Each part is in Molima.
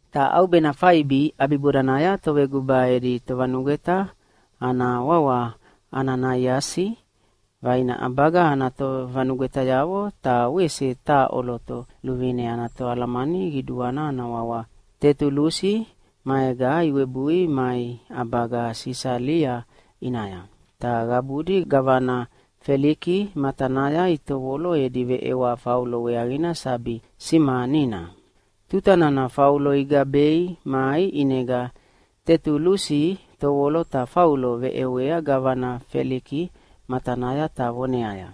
Ta ʼaubena faibi ʼabibodanaya toveguba edi tovanugweta ana wawa Ananaiasi vaina ʼabaga ana tovanugwetayavo ta wese taha ʼoloto luvine ana toalamani qiduana ana wawa Tetulusi maega iwebui mai ʼabaga Sisalia ʼinaya. Ta qabudi gavana Feliki matanaya itovolo edi veʼewa Faulo weaqina sabi simanina. Tuta nana Faulo igabei mai ʼinega Tetulusi tovolo ta Faulo veʼewea gavana Feliki matanaya ta voneaya,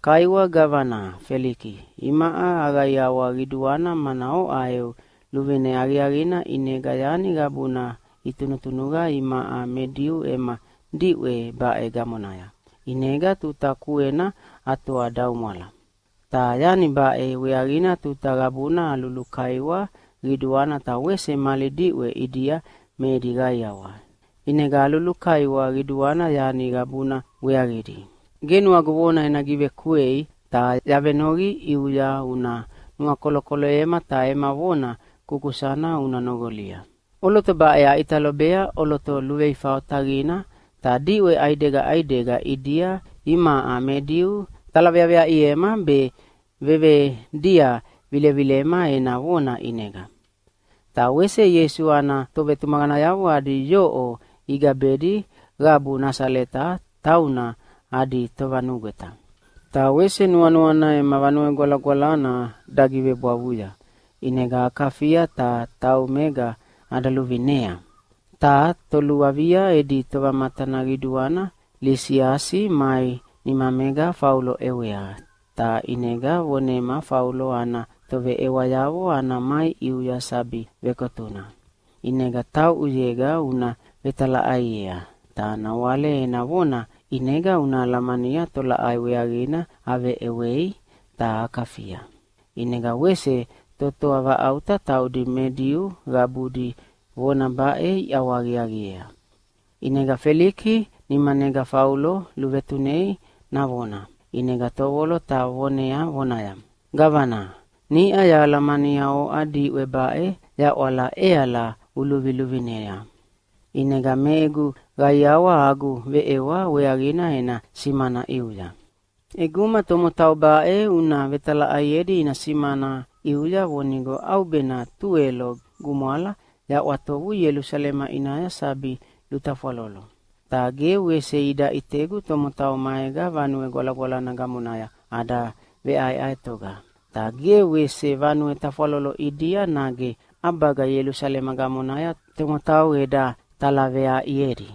“Kaiwa gavana Feliki, imaʼa aqaiawa qiduana mana oʼa eu luvine aqiaqina ʼinega yani qabuna itunuqa imaʼa me Diu ema diʼwe baʼe gamonaya, ʼinega tuta kuena atoadaumwala. Ta yani baʼe weaqina tuta qabuna alulukaiwa qiduana ta wese mali diʼwe ʼidia me edi qaiawa. ʼInega alulukaiwa qiduana yani qabuna weaqidi. Ge nuagu vona ena givekuei ta yavenoqi ʼiuya una nuakolokoloyema ta ema vona kukusana una noqolia. ʼOloto baʼe aʼita lobea ʼoloto luveifa otaqina ta diʼwe ʼaidega ʼaidega ʼidia imaʼa me Diu talaveaveaʼiema be vevedia vilevilema ena vona ʼinega. Ta wese Ieisu ana tovetumaqanayavo adi yoʼo igabedi qabu Nasaleta tauna adi tovanugweta. Ta wese nuanuana ema Vanue Gwalagwalana dagivebwavuya ʼinega akafia ta taumega ada luvineyea. Ta toluavia edi tovamatana qiduana Lisiasi mai nimamega Faulo ʼewea, ta ʼinega vonema Faulo ana toveʼewayavo ana mai ʼiuya sabi vekotuna. ʼInega tauʼuyega una vetalaʼaiea, ta nawale ena vona ʼinega una alamania tolaʼai weaqina aveʼewei ta akafia.” ʼInega wese totoa vaʼauta taudi me Diu qabudi vona baʼe iʼawahaqiaqiea. ʼInega Feliki nimanega Faulo luvetunei navona, ʼinega tovolo ta vonea vonaya, “Gavana, niʼa yahalamania oʼa diʼwe baʼe yaʼwala ʼeala uluviluvinea. ʼInega me egu qaiawa agu veʼewa weaqina ena simana ʼiuya. ʼEguma tomotau baʼe una vetalaʼaiedi ina simana ʼiuya vonigo ʼaubena tuwelo gumwala yaʼwatovu Ielusalema ʼinaya sabi lutafwalolo. Ta ge wese ida ʼitegu tomotau maega Vanue Gwalagwalana gamonaya ada veʼaeʼaetoga. Ta ge wese vanue tafwalolo ʼidia nage ʼabaga Ielusalema gamonaya tomotau eda talaveaʼiedi.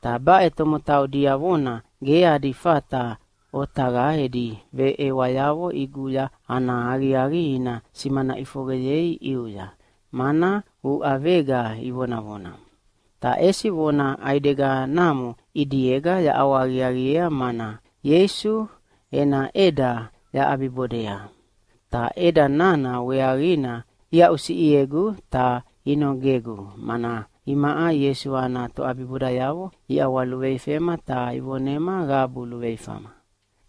Ta baʼe tomotau diavona ge adi fata otaqa edi veʼewayavo ʼiguya ana aqiaqi ina simana ʼifoqeyei ʼiuya, mana uʼavega ivonavona. Ta ʼesi vona ʼaideganamo ʼidiega yaʼawahaqiaqiea, mana Ieisu ena ʼeda yaʼabiʼabibodea. Ta ʼeda nana weaqina iaʼusiʼiegu ta inogegu, mana imaʼa Ieisu ana toʼabibodayavo iʼawaluveifema ta ivonema qabu luveifama.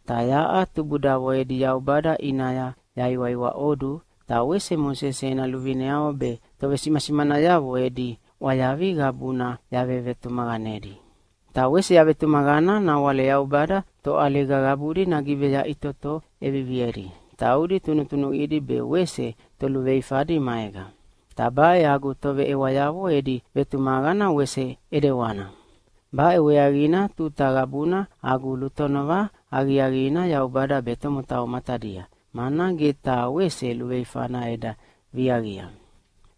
Ta yaʼa tubudavo edi Yaubada ʼinaya yaiwaiwaʼodu ta wese Mosese ena luvineavo be tovesimasimanayavo edi ʼwayavi qabuna yavevetumaqanedi. Ta wese yavetumaqana nawale Yaubada toʼaliga qabudi nagiveyaʼitoto ʼeviviedi, taudi tunutunuqidi be wese toluveifadi maega. Ta baʼe agu toveʼewayavo edi vetumaqana wese ʼedewana. Baʼe weaqina tuta qabuna agu lutonova aqiaqina Yaubada be tomotau matadia, mana ge taha wese luveifana eda viaqia.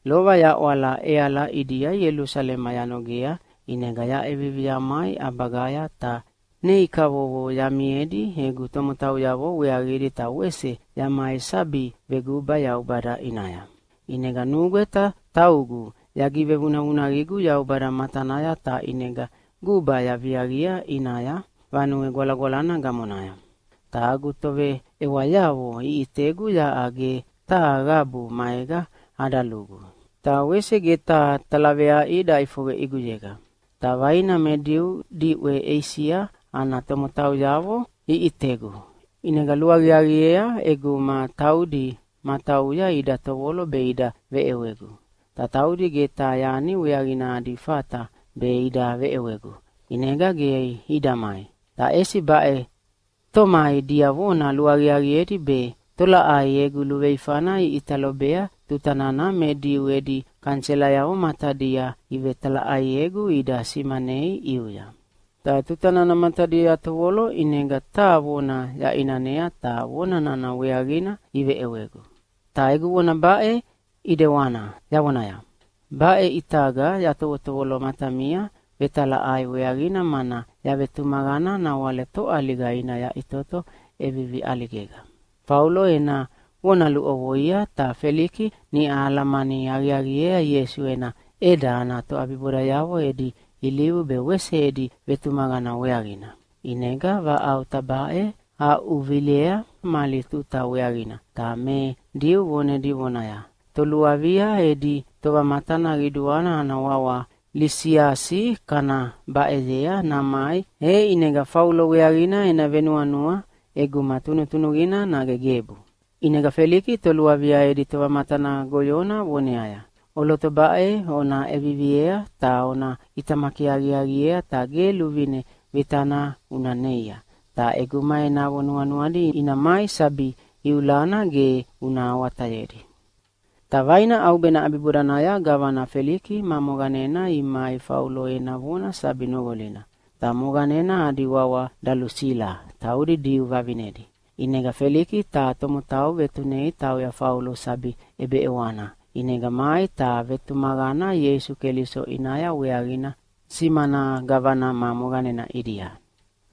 “Lova yaʼwala ʼeala ʼidia Ielusalema yanogea, ʼinega yaʼevivi yamai ʼabagaya ta nei kavovo yamiedi egu tomotauyavo weaqidi ta wese yamai sabi veguba Yaubada ʼinaya. ʼInega nugweta taugu yagivevunavunaqigu Yaubada matanaya ta ʼinega guba yaviaqia ʼinaya Vanue Gwalagwalana gamonaya. Ta agu toveʼewayavo iʼitegu yaʼa ge taha qabu maega ada lugu, ta wese ge taha talaveaʼi daʼifoqe ʼiguyega. Ta vaina me Diu diʼwe Eisia ana tomotauyavo iʼitegu, ʼinega luaqiaqiea ʼeguma taudi matauya ida tovolo be ida veʼewegu. Ta taudi ge taha yani weaqina adi fata be ida veʼewegu, ʼinega ge ida mai. Ta ʼesi baʼe tomai diavona luaqiaqiedi be tolaʼai egu luveifana iʼita lobea tuta nana me Diu edi kaniselayavo matadia ivetalaʼaiegu ida simanei ʼiuya. Ta tuta nana matadia yatovolo ʼinega taha vona yaʼinanea ta vonana weaqina iveʼewegu. Ta egu vona baʼe ʼidewana yavonaya, ‘Baʼe ʼitaga yatovotovolo matamia vetalaʼai weaqina mana yavetumaqana nawale toʼaliga ina yaʼitoto ʼevivi ʼaligega.’” Faulo ena vona luʼovoia, ta Feliki niʼa alamani aqiaqiea Ieisu ena ʼeda ana toʼabibodayavo edi ilivu be wese edi vetumaqana weaqina. ʼInega vaʼauta baʼe aʼuvilea mali tuta weaqina, ta me Diu vonedi vonaya, “Toluavia edi tovamatana qiduana ana wawa Lisiasi kana baʼeyea namai, e ʼinega Faulo weaqina ena venuanua ʼeguma tunutunuqina nage gebu.” ʼInega Feliki toluavia edi tovamatana goyona voneaya, “ʼOloto baʼe ona ʼeviviea ta ona ʼitamaki aqiaqiea ta ge luvine vitana una neia. Ta ʼeguma enavo nuanuadi ina mai sabi iulana ge una awatayedi.” Ta vaina ʼaubena ʼabibodanaya gavana Feliki ma moqanena imai Faulo ena vona sabi noqolina. Ta moqanena adi wawa Dalusila, taudi Diu vavinedi. ʼInega Feliki taha tomotau vetunei tauya Faulo sabi ʼebeʼewana, ʼinega mai ta vetumaqana Ieisu Keliso ʼinaya weaqina simana gavana ma moqanena ʼidia.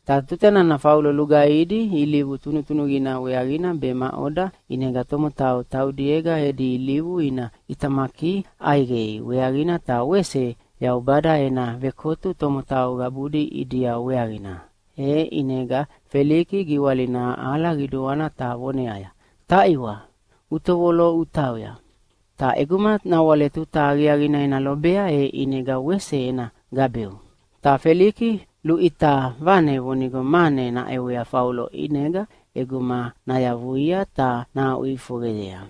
Ta tuta nana Faulo lugaihidi ilivu tunutunuqina weaqina be maʼoda ʼinega tomotau taudiega edi ilivu ina ʼitamaki ʼaiqei weaqina ta wese Yaubada ena vekotu tomotau qabudi ʼidia weaqina, e ʼinega Feliki giwalina aʼala qiduana ta voneaya, “Taʼiwa, utovolo utauya! Ta ʼeguma nawale tuta aqiaqina ena lobea e ʼinega wese ena gabeu.” Ta Feliki luʼita vane vonigo mane naʼewea Faulo ʼinega ʼeguma nayavuia ta nahaʼuʼifoqeyea.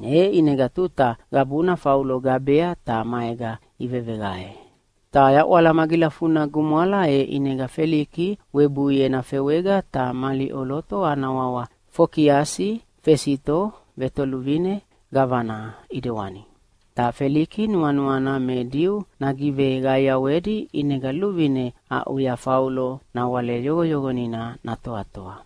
E ʼinega tuta qabuna Faulo gabea ta maega iveveqae. Ta yaʼwala magilafuna gumwala e ʼinega Feliki webui ena fewega ta mali ʼoloto ana wawa Fokiasi Fesito vetoluvine gavana ʼidewani. Ta Feliki nuanuana me Diu nagiveqaiawedi, ʼinega luvine aʼuya Faulo nawale yoqoyoqonina natoatoa.